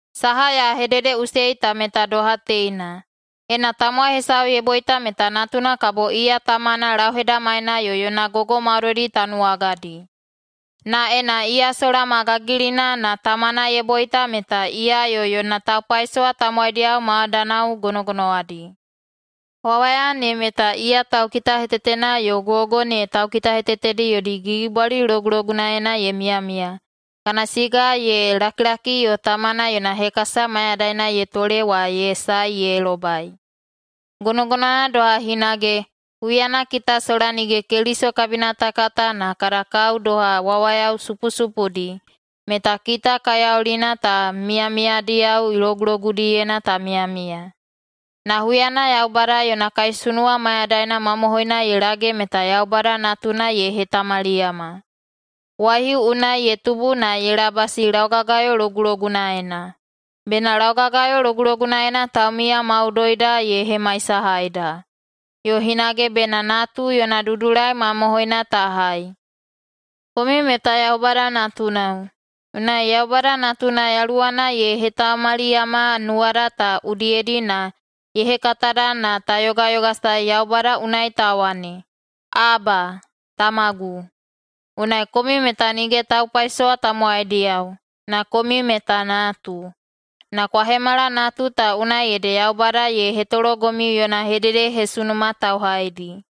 Saha ya hededeꞌusei ta meta doha teina: Ena tamowai hesau ye boita meta natuna kabo iya tamana lauhedamaina yo yona gogo maudoidi tanuwagadi. Na ena iya sola ma gagilina na tamana ye boita meta iya yo yona taupaisowa tamowaidiyao maidanao gonogonowadi. Wawaya ne meta iya taukitahetetena yo gogo ne taukitahetetedi yodi gigibwali logulogunaena ye miyamiya kana siga ye lakilaki yo tamana yona hekasa mayadaina ye tole wa ye sae ye lobai. Gonogonowana doha hinage, huyana kita sola nige Keliso kabina ta kata na kada kao doha wawayao supusupudi, meta kita kaiyaulina ta miyamiyadiyao logulogudiyena ta miyamiya. Na huyana Yaubada yona kaisunuwa mayadaina mamohoina ye lage meta Yaubada Natuna ye hetamaliyama. Waihiu unai ye tubu na ye labasi laugagayo logulogunaena, bena laugagayo logulogunaena taumiya maudoida ye hemaisahaida, yo hinage bena natu yona dudulai mamohoina ta hai. Komiu meta Yaubada natunao, unai Yaubada Natuna yaluwana ye hetamaliyama nuwada ta udiyedi na ye hekatada na ta yogayogasae Yaubada unai ta wane, “Aba, Tamagu!” Unai komiu meta nige taupaisowa tamowaidiyao, na komiu meta natu. Na kwa hemala natu ta unai ede Yaubada ye hetologomiu yona hededehesunuma tauhaidi.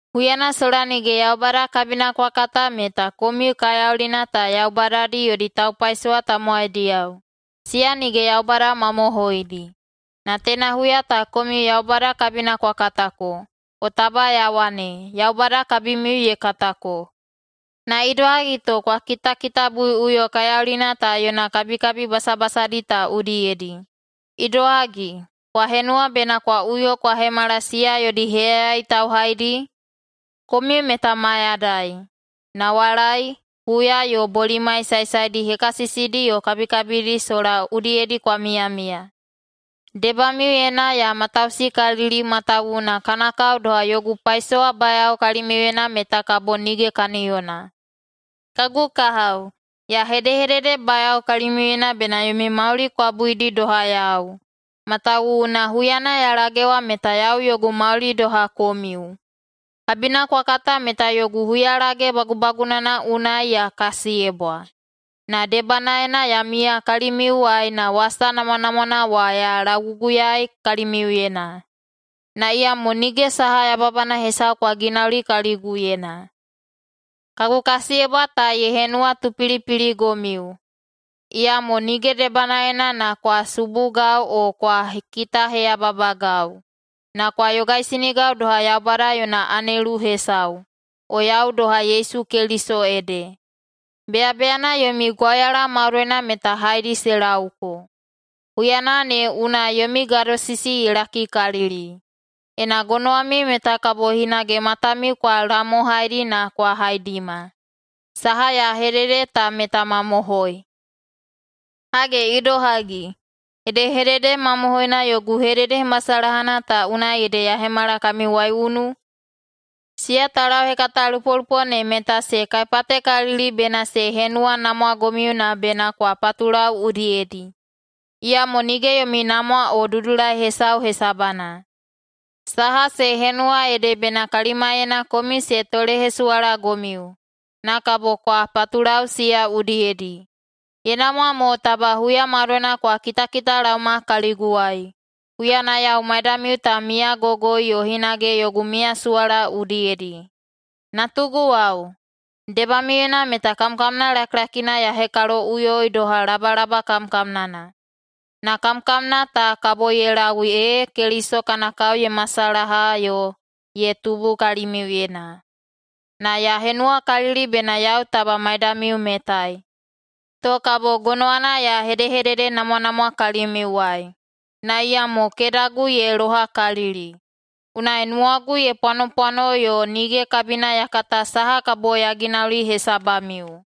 Huyana sola nige Yaubada kabina kwa kata meta komiu kaiyaulina ta yaubadadi yodi taupaisowa tamowaidiyao, siya nige yaubada mamohoidi. Na teina huya ta komiu Yaubada kabina kwa katako, o taba ya wane, Yaubada kabimiu ye katako. Na idohagi to kwa kitakitabuiꞌuyo kaiyaulina ta yona kabikabi basabasadi ta udiyedi. Idohagi, kwa henuwa bena kwa uyo kwa hemala siya yodi heyayai tauhaidi? Komiu meta mayadai, nawalai, huya yo bolimai saesaedi hekasisidi yo kabikabidi sola udiyedi kwa miyamiya. Debamiuyena ya matausikalili matawuwuna kana kao doha yogu paisowabayao kalimiuyena meta kabo nige kaniyona. Kagu kahao, ya hedehededebayao kalimiuyena bena yomi mauli kwa buidi doha yau, matawuwuna huyana ya lagewa meta yau yogu mauli doha komiu. Kabina kwa kata meta yogu huyalage bagubagunana unai ya kasiyebwa, na debanaena ya miya kalimiuwai na wasa namwanamwana wa ya lauguguyaei kalimiuyena. Na iyamo nige saha yababana hesau kwa ginauli kaliguyena. Kagu kasiyebwa ta ye henuwatupilipiligomiu, iyamo nige debanaena na kwa subugau o kwa kitaheyababagau, na kwa yogaisinigau doha Yaubada yona anelu hesau, o yau doha Yesu Keliso ede. Beyabeyana yomi gwauyala maudoina meta haedi se lauko. Huyana ne unai yomi gadosisi ye lakikalili. Ena gonowamiu meta kabo hinage matamiu kwa lamohaidi na kwa haidima – saha ya hedede ta meta mamohoi! Hage idohagi, hedehedede mamohoina yogu hededehemasalahana ta unai ede ya hemala kami waiunu? Siya taulauhekatalupolupo ne meta se kaipatekalili bena se henuwanamwagomiu na bena kwa patulau udiyedi, iyamo nige yomi namwa o dudulai hesau hesabana. Saha se henuwa ede bena kalimaiyena komiu se tolehesuwalagomiu, na kabo kwa patulau siya udiyedi. Ye namwa mo taba huya maudoina kwa kitakitalaoma kaliguwai, huyana yau maidamiu ta miyagogoi yo hinage yogu miyasuwala udiyedi. Natuguwao, debamiuyena meta kamkamna lakilakina ya hekaloꞌuyoi doha labalaba kamkamnana, na kamkamna ta kabo ye lau ee Keliso kana kao ye masalaha yo ye tubu kalimiuyena. Na ya henuwakalili bena yau taba maidamiu metai, to kabo gonowana ya hedehededenamwanamwa kalimiuwai, na iyamo kedagu ye lohakalili. Unai nuwagu ye pwanopwano yo nige kabina ya kata saha kabo ya ginauli hesabamiu.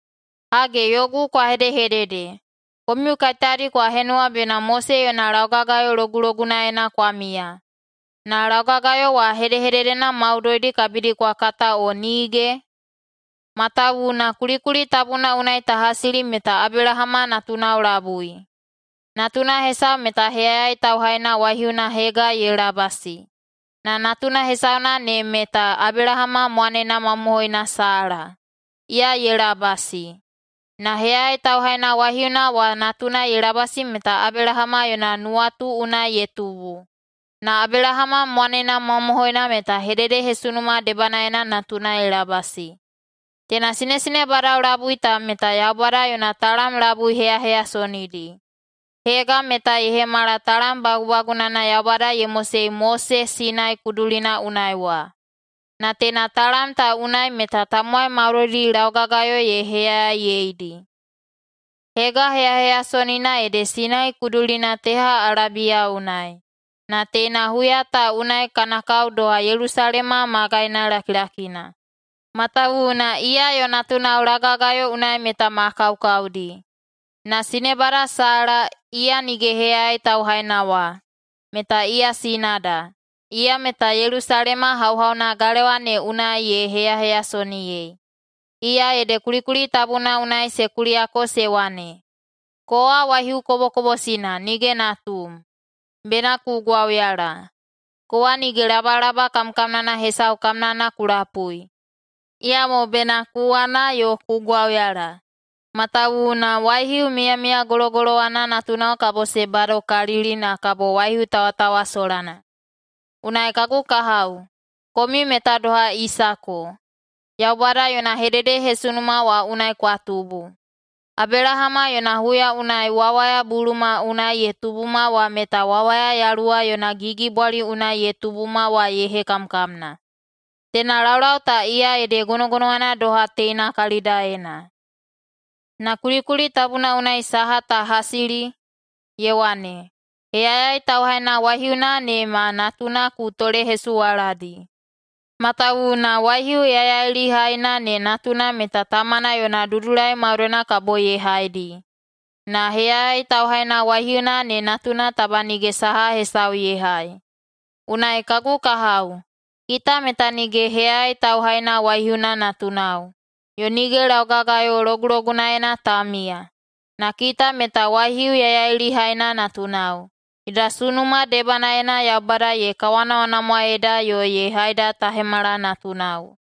Hage, yogu kwa hedehedede, komiu kaiteyadi kwa henuwa bena Mose yona laugagayo logulogunaena kwa miya, na laugagayo wa hedehededena maudoidi kabidi kwa kata o nige? Matawuwuna kulikuli tabuna unai ta hasili meta Abelahama natunao labui. Natuna hesau meta heyayai tauhaina waihiuna Hega ye labasi, na natuna hesauna ne meta Abelahama mwanena mamohoina Sala, iya ye labasi. Na heyayai tauhaina waihiuna wa natuna ye labasi meta Abelahama yona nuwatu unai ye tubu, na Abelahama mwanena mamohoina meta hededehesunuma debanaena natuna ye labasi. Teina sinesinebadao labui ta meta Yaubada yona talam labui heyaheyasonidi. Hega meta ye hemala talam bagubagunana Yaubada ye mosei Mose Sinai kudulina unai wa, na teina talam ta unai meta tamowai maudoidi laugagayo ye heyayaiyedi. Hega heyaheyasonina ede Sinai kudulina teha Alabiya unai, na teina huya ta unai kana kao doha Yelusalema magaina lakilakina, matawuwuna iya yo natunao laugagayo unai meta ma kaukaudi. Na sinebada Sala, iya nige heyayai tauhaina wa, meta iya sinada. Iya meta Yelusalema hauhauna galewa ne unai ye heyaheyasoniyei. Iya ede kulikuli tabuna unai se kuliyako se wane, “Kowa waihiu kobokobosina nige natum, bena ku gwauyala. Kowa nige labalaba kamkamnana hesau kamnana ku lapui, iyamo bena ku wana yo ku gwauyala, matawuwuna waihiu miyamiyagologolowana natunao kabo se badokalili na kabo waihiu tawatawasolana.” Unai kagu kahao, komiu meta doha Isako, Yaubada yona hededehesunuma wa unai kwa tubu. Abelahama yona huya unai wawaya buluma unai ye tubuma wa meta wawaya Yaluwa yona gigibwali unai ye tubuma wa ye hekamkamna. Teina laulau ta iya ede gonogonowana doha teina kalidaena. Na kulikuli tabuna unai saha ta hasili? Ye wane, “Heyayai tauhaina waihiuna ne ma natuna ku tolehesuwaladi, matawuwuna waihiu yaiyailihaina ne natuna meta tamana yona dudulai maudoina kabo ye haidi, na heyayai tauhaina waihiuna ne natuna taba nige saha hesau ye hai.” Unai kagu kahao, kita meta nige heyayai tauhaina waihiuna natunao, yo nige laugagayo logulogunaena ta miya. Na kita meta waihiu yaiyailihaina natunao, yoda sunuma debanaena Yaubada ye kawanamwanamwaeda yo ye haida ta hemala natunao.